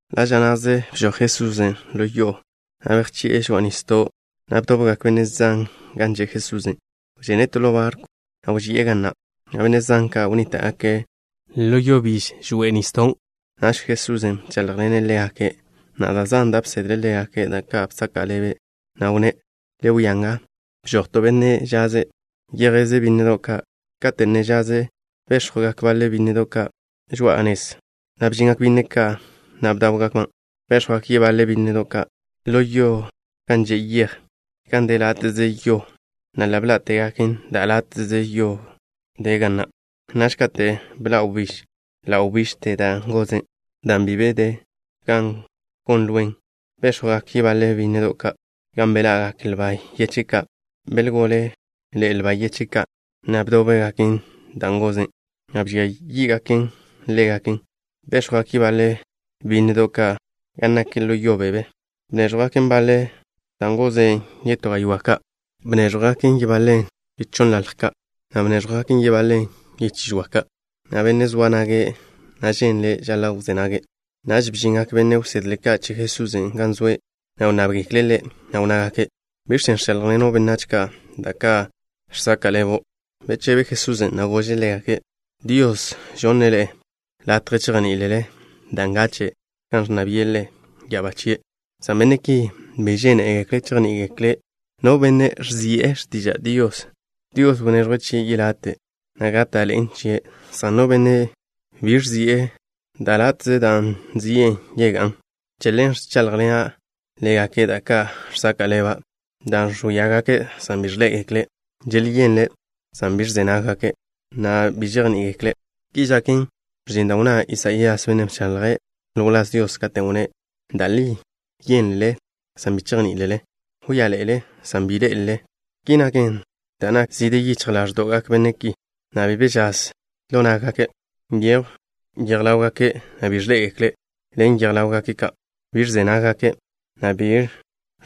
Ḻa' ža na'ze bžoj Jesusen' ḻo yo'o, na' bejsóe' žoa'a nisdo'. Dan' bdobgak benne' zan gan zoa Jesusen', wžene' to ḻo barkw, na' wži'e ga na', na' benne' zan ka' wnníta'gake' ḻo yo biž žoa'a nisdon'. Naž Jesusen' bcháḻjḻene' ḻégake', na' da' zan da' bsedle' ḻégake', da' ka' bsaka' ḻebe', na' wnné': —Le wia nga, bžoj to benne' žaz, yjeze' bínnedo' ka'. Kate' ne zjeze', béx̱jwgak baḻe bínnedo' ka' žoa'a nez, na' bžingak byínnedo' ka', na' bdáwgakban'. Béx̱jwgak yebaḻe bínnedo' ka' ḻo yo gan že' yej, gan de láte'ze yo, na' ḻa' bḻá'tegaken, dan' de láte'ze yo ga na'. Naž kate' bḻa' wbíž, ḻa' wbižte dan' goze', dan' bi zoa gan gon lwen. Béx̱jwgak yebaḻe bínnedo' ka' gan beḻa'gak lba yeche' ka'. Belgóleḻe'e lba yeche' ka', na' bdóbgaken dan' goze', na' bžia yí'gaken ḻégaken. Béx̱jwgak yebaḻe bínnedo' ka' gan nak ḻo yo beb, na' bnéẕjwgaken. Bnéẕjwgak baḻe dan' goze' yetó gaywá' ka'. Bnéẕjwgaken yebaḻen yechonnḻalj ka', na' bnéẕjwgaken yebaḻen yechí žoa ka'. No benne' zoa nage', na' ženle', žaḻa' wzé nage'. Naž bžingak benne' wsedle ka' che Jesusen' gan zoe', na' wnnábgekle' Ḻe', na' wnnágake': —¿Biẕ chen' ẕcháḻjḻeno' benách ka' da' ka' žsaka' ḻebo'? Bechebe Jesusen', na' gože' ḻégake': —Dios žonne' ḻe'e latje chejní'ilele da' ngache' kan ẕnna bi'e Ḻe' ya'abá chie', san benne' ki bi žénegekle' chejní'igekle'. No benne' ẕzi'e x̱tiža' Dios, Dios wneẕjwe' chie' yelate', na' gáta'ḻe'en chie', san no benne' bi ẕzi'en, da' do'ze dan' ba nzi'e yegá'n. Che ḻen ẕcháḻjḻena' ḻégake' da' ka' žsaka' ḻeba', dan' ẕwíagake' san bi ẕḻé'egekle'. Želyenle' san bi ẕze nággake', na' bi žejní'igekle'. Ki žaken, ẕžin da' wnná Isaías, bennen' bchaḻje' ḻo wláz Dios, katen' wnné': Da' li yénlele san bi chejní'ilele. Wíaḻe'ele san bi ḻé'elele da' nakkzen. Ki naken dan' nak zide yichj ḻáẕdo'gak benne' ki, na' bi be žaz ḻo yichj nággake'. Nyejw yej ḻáwgake', na' bi ẕḻé'egekle' ḻen yej ḻáwgake' ka'. Bi ẕze nággake' na' bi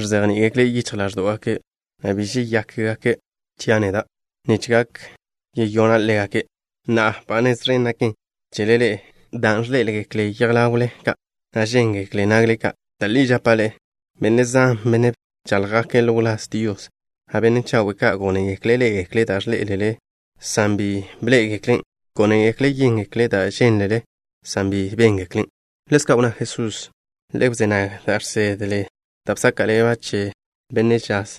ẕzejní'igekle' yichj ḻáẕdo'gake', na' bi žeyákgake' chia' neda', nich gak yeyona' ḻégake'. ’Na'a, ba nez ẕen naken chele ḻe'e, dan' ẕḻé'egekle yej ḻawle ka', na' žéngekle nagle ka'. Da' li žapa' ḻe'e, benne' zan, benne' bcháḻjgake' ḻo wláz Dios, na' benne' chawe' ka', gónegekle' ḻé'egekle' da' ẕḻé'elele ḻe'e, san bi bḻé'egeklen'. Gónegekle' yéngekle' da' žénlele ḻe'e, san bi béngeklen'. Ḻezka' wnná Jesusen': —Le wzé nag da' žsedle da' bsaka' ḻeba' che benne' žaz.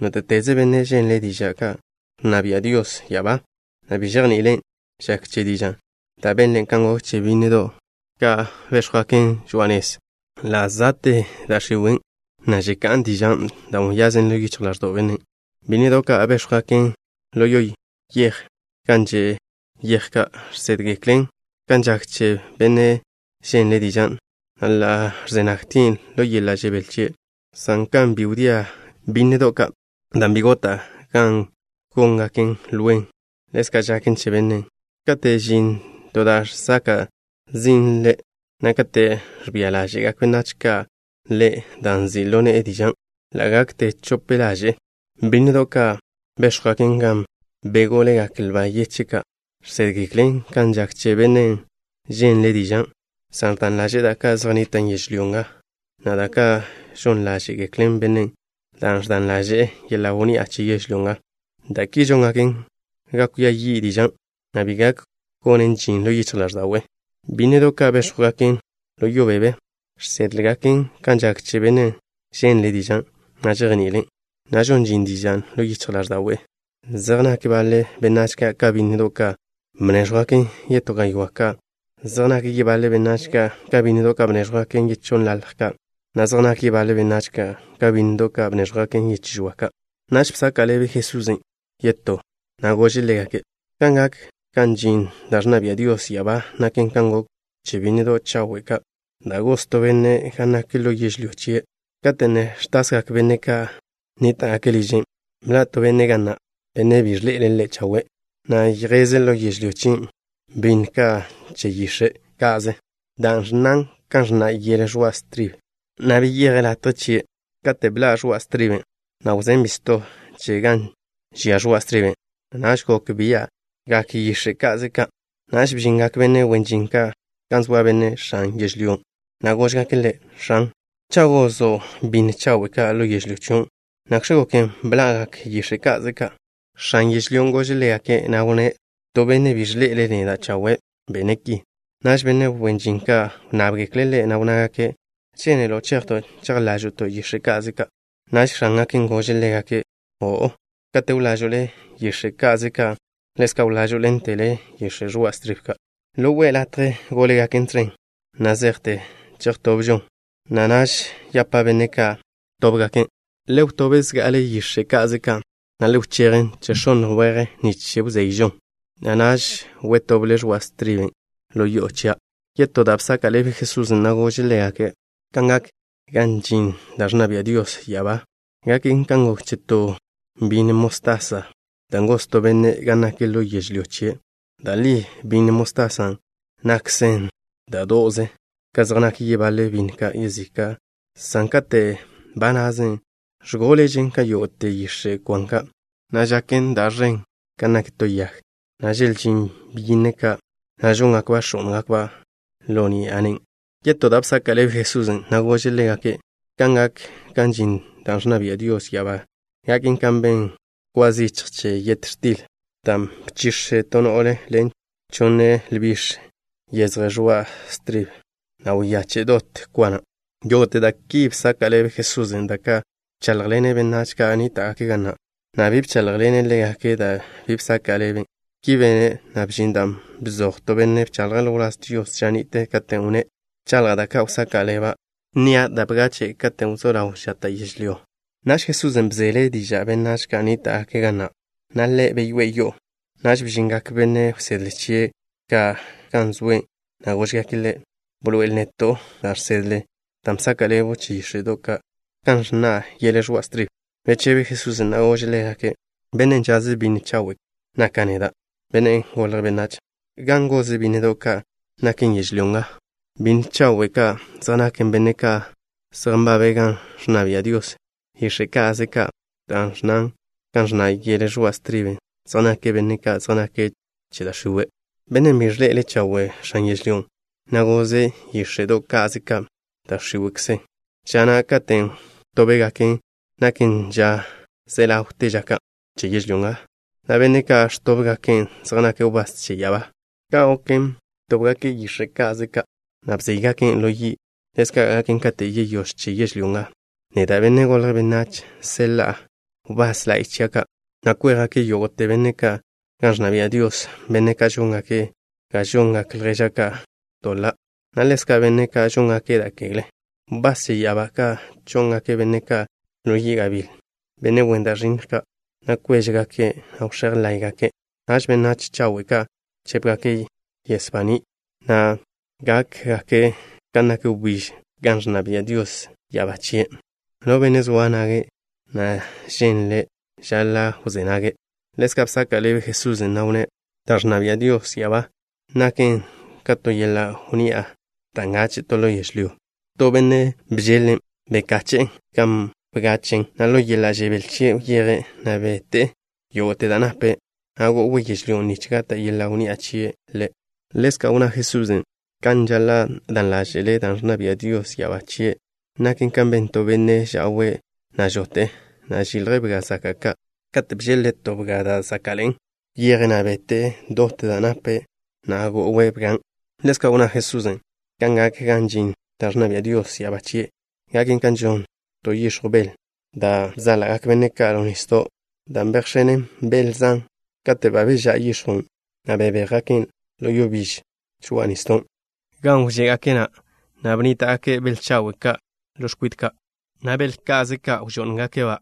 Nóte'teze benne' ženle' diža' kan ẕnna bia' Dios ya'abá, na' bi žejni'ilen', žak che diža' da' benlen' kan gok che bínnedo' ka' béx̱jwgaken žoa'a nez. Ḻa' za'te da' x̱iwe', na' žeká'n dižan' da' wyazen ḻo yichj ḻáẕdo'w bennen'. Bínnedo' ka' béx̱jwgaken ḻo yežlyón' gan že' yej žsédgeklen kan žak che no benne' ženle' dižan', na' ḻa' ẕze nagtien' ḻo yeḻa' žebél chie', san kan bi wdia'gak bínnedo' ka' dan' bi gota' gan góngaken lwen, ḻezka' žaken che bennen'. Kate' žin to da' žsaka' zin' ḻe', na' kate' ẕbia ḻáže'gak benách ka' ḻe' dan' nzi' ḻo ne'e dižan', ḻa' gakte chope ḻaže'e. Bínnedo' ka' béx̱jwgaken gan bególegak lba yeche' ka' žsédgeklen kan žak che bennen' ženle' dižan', san ẕdan ḻaže'e da' ka' zej nnitan' yežlyó nga, na' da' ka' žon ḻáže'geklen bennen' dan' ẕdan ḻaže'e yeḻa' wnni'a che yežlyó nga. Da' ki žóngaken ga kwia yi' dižan', na' bi gak gonen žin ḻo yichj ḻáẕda'we'. Bínnedo' ka' béx̱jwgaken ḻo yo beb žsédgeklen kan žak che bennen' ženle' dižan', na' žejni'ilen', na' žon žin dižan' ḻo yichj ḻáẕda'we'. Zej nak baḻe benách ka' ka bínnedo' ka' bnéẕjwgaken yetó gaywá' ka'. Zej nak yebaḻe benách ka' ka bínnedo' ka' bnéẕjwgaken yechonnḻalj ka', na' zej nak yebaḻe benách ka' ka bínnedo' ka' bnéẕjwgaken yechí žoa ka'. Naž bsaka' ḻebe Jesusen' yetó, na' gože' ḻégake': —Kan gak gan žin da' ẕnna bia' Dios ya'abá naken kan gok che bínnedo' chawe' ka' da' goz to benne' gan nak ḻo yežlyó chie'. Kate' ne ẕtasgak benne' ka' nníta'gake' liže', bḻa' to benne' ga na', benne' bi ẕḻe'ele' ḻe' chawe', na' yjeze' ḻo yežlyó chien' bínnedo' ka' che yix̱e' ka'ze dan' ẕnnan' kan ẕnna' yele ẕoa' stribe, na' beyeje' latje chie'. Kate' bḻa' ẕoa' striben', na' wžé' bisto chen gan žia ẕoa' striben', naž gok bia'gak yíx̱e'do' ka'ze ka'. Naž bžingak benne' wen žin ka' gan zoa benne' x̱an yežlyón', na' góžgake' ḻe': “X̱an, cha' gozo' bínnedo' chawe' ka' ḻo yežlyó chion', ¿nakx̱ goken bḻa'gak yíx̱e'do' ka'ze ka'?” X̱an yežlyón' gože' ḻégake', na' wnné': “To benne' bi ẕḻe'ele' neda' chawe' bene' ki.” Naž benne' wen žin ka' wnnábgekle' ḻe', na' wnnágake': “¿Žénelo' chejto' chejḻážo'to' yíx̱e'do' ka'ze ka'?” Naž x̱ángake' gože' ḻégake': “O'o. Kate' wlážo'le yíx̱e'do' ka'ze ka', ḻezka' wlážo'ḻentele yele ẕoa' stribe ka'. Gakže chawe' gonnle latje gólegaken tẕen na' zejte chejtobžon, na' naž yapa' benne' ka' wtóbgaken': le wtób zga'ale yíx̱e'do' ka'ze ka', na' le wchejen chejx̱ónn weje nich wzeyžon, na' naž wtoble ẕoa' striben' ḻo yo'o chia'.” Yetó da' bsaka' ḻebe Jesusen', na' gože' ḻégake': —Kan gak gan žin da' ẕnna bia' Dios ya'abá, gaken kan gok che to bínnedo' mostasa, dan' goz to benne' gan nak ḻo yežlyó chie'. Da' li bínnedo' mostasa na' nakžen da' do'ze ka zej nak yógo'te bínnedo' yezika' ka', san kate' ba nazen, ẕgóležen ka yógo'te yix̱e' kwan ka', na' žaken ẕen kan nak to yag, na' želžín byínnedo' ka', na' žóngakba' x̱ó'ngakba' ka' ḻo ni'a nen'. Yetó da' bsaka' ḻebe Jesusen', na' gože' ḻégake': —Kan gak gan žin da' ẕnna bia' Dios ya'abá gaken ka ben kwa zichj che yet x̱til, dan' bchix̱e to no'le ḻen chonne lbix̱ yezje ẕoa' stribe, na' wyache' dot kwa na'. Yógo'te da' ki bsaka' ḻebe Jesusen', da' ka' bcháḻjḻene' benách ka' nníta'gake' ga na', na' bi bcháḻjḻene' ḻégake' da' bi bsaka' ḻeben'. Ki bene', na' bžin dan' bzoj to benne' bchaḻje' ḻo wláz Dios ža ni'te, katen' wnné': Wchaḻja' da' ka' wsaka' ḻeba'. Nnia' da' bgache' katen' wzó ḻaw žata' yežlyó. Naž Jesusen' bzele diže'e benách ka' nníta'gake' ga na', na' beseḻe'e ḻégake', na' Ḻe' beyoé'e yo'o. Naž bžingak benne' wsedle chie' ka' gan zoe', na' góžgake' Ḻe': —Bḻoe'el neto' da' žsedle dan' bsaka' ḻebo' che yíx̱e'do' ka'ze dan' ẕnnan' kan ẕnna' yele ẕoa' stribe. Bechebe Jesusen', na' gože' ḻégake': —Benne' žaze' bínnedo' chawe' naka' neda', Benne' Golje' Benách. Ga na' goze' bínnedo' ka' naken yežlyó nga, na' bínnedo' chawe' ka' zej naken benne' ka' zej nbabe' gan ẕnna bia' Dios. Yíx̱e'do' ka'ze ka' dan' ẕnnan' kan ẕnna' yele ẕoa' stribe zej naken benne' ka' zej nake' che da' x̱iwe'. Bennen' bi ẕḻe'ele' chawe' x̱an yežlyón', na' goze' yíx̱e'do' ka'ze ka', da' x̱íwe'kze naken. Ža na' katen' wtóbgaken' naken ža ze ḻawte ža ka' che yežlyó nga, na' benne' ka' ẕtóbgaken' zej nake' wbás che ya'abá ka'. Kan goken, btóbgake' yíx̱e'do' ka'ze ka', na' bzéygaken' ḻo yi', ḻezka' gaken kate' yeyóž che yežlyó nga. Neda', Benne' Golje' Benách, seḻa'a wbás la'y chia' ka', na' kwéjgake' yógo'te benne' ka' gan ẕnna bia' Dios, benne' ka' žóngake' ga žongak ljéžgake' ka' doḻa', na' ḻezka' benne' ka' žóngake' da' kegle. Wbás che ya'abá ka' chó'ngake' benne' ka' ḻo yi' gabíl, benne' wen da' ẕinnj ka', na' kwéžegake', na' wx̱éj láye'gake'. Naž benách chawe' ka' chépgake' yes baní', na' gákgake' kan nak wbíž gan ẕnna bia' Dios ya'abá chie'. No benne' zoa nage', na' ženle', žaḻa' wzé nage'. Ḻezka' bsaka' ḻebe Jesusen', na' wnné': —Da' ẕnna bia' Dios ya'abá chie' naken ka to yeḻa' wnni'a, da' ngache' to ḻo yežlyó. Katen' to benne' bžeḻ-len', bekache'en gan bgachen', na' ḻo yeḻa' žebél chie' wyeje', na' bete'e yógo'te da' nape', na' go'we' yežlyón' nich gata' yeḻa' wnni'a na' chie' ḻe'. Ḻezka' wnná Jesusen': —Kan žaḻa' dan ḻáže'le da' ẕnna bia' Dios ya'abá chie' naken kan ben to benne' ža'we', na' žote'e, na' žilje' bga zaka' ka'. Kate' bžeḻ-le' to bga da' záka'ḻe'en, wyeje', na' bete'e dot da' nape', na' go'we' bgan'. Ḻezka' wnná Jesusen': —Kan gak gan žin da' ẕnna bia' Dios ya'abá chie', gaken kan žon to yix̱jw bel da' bzáḻa'gak benne' ka' ḻo nisdo', dan' bejx̱enen bel zan. Katen' ba bežá' yix̱jwn', na' bebéjgaken' ḻo yo biž žoa'a nisdon', gan wžé'gake', na' bnníta'gake' bel chawe' ka' ḻo x̱kwite ka', na' bel ka'ze ka' wžó'ngake' ḻégakba'.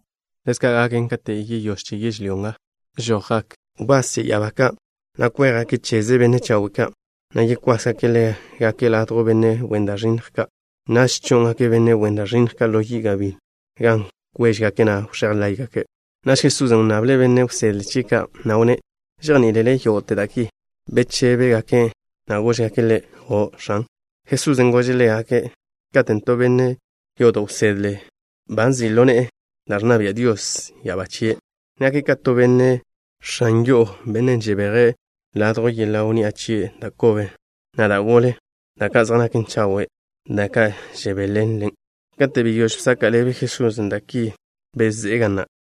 Ḻezka' gaken kate' yeyóž che yežlyó nga. Žojgak wbás che ya'abá ka', na' kwéjgake' cheze benne' chawe' ka', na' yekwásgake' ḻégake' ladjw benne' wen da' ẕinnj ka'. ’Naž chó'ngake' benne' wen da' ẕinnj ka' ḻo yi' gabíl, gan kwéžegake', na' wx̱éj láye'gake'. Naž Jesusen' wnnable' benne' wsedle chie' ka', na' wnné': —¿Žejní'ilele yógo'te da' ki? Bechébegake', na' góžgake' Ḻe': —O', X̱an. Jesusen' gože' ḻégake': —Katen' to benne' yodo' wsedle ba nzi' ḻo ne'e da' ẕnna bia' Dios ya'abá chie', nake' ka to benne' x̱an yo'o, benne' žebeje' ladjw yeḻa' wnni'a chie' da' kobe, na' da' gole, da' ka' zej naken chawe', da' ka' žebéḻenlen'. Kate' beyóž bsaka' ḻebe Jesusen' da' ki, bezé'e ga na'.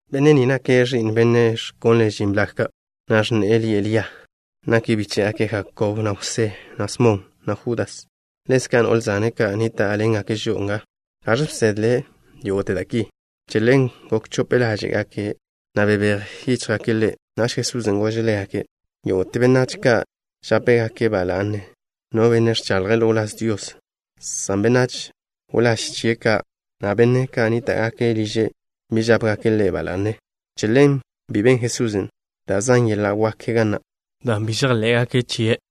Benne' ni nake' ẕi'n benne' ẕkonle' žin blag ka', na' x̱ne'e lie' Lia. Nake' bíche'gak Jakob, na' Jwsé, na' Smon, na' Judas. Ḻezka' no'le zane' ka' nníta'ḻengake' žo'o nga. ¿Gaẕ bsedle' yógo'te da' ki? Che ḻen gok chope ḻáže'gake', na' bebéj yíchjgake' Ḻe'. Naž Jesusen' gože' ḻégake': —Yógo'te benách ka' žápegake' ba la'ne no benne' ẕchaḻje' ḻo wláz Dios, san benách wláž chie' ka', na' benne' ka' nníta'gake' liže' bi žápegake' ḻe' ba la'ne. Che ḻen bi ben Jesusen' da' zan yeḻa' wak ka' ga na', dan' bi žejḻé'gake' chie'.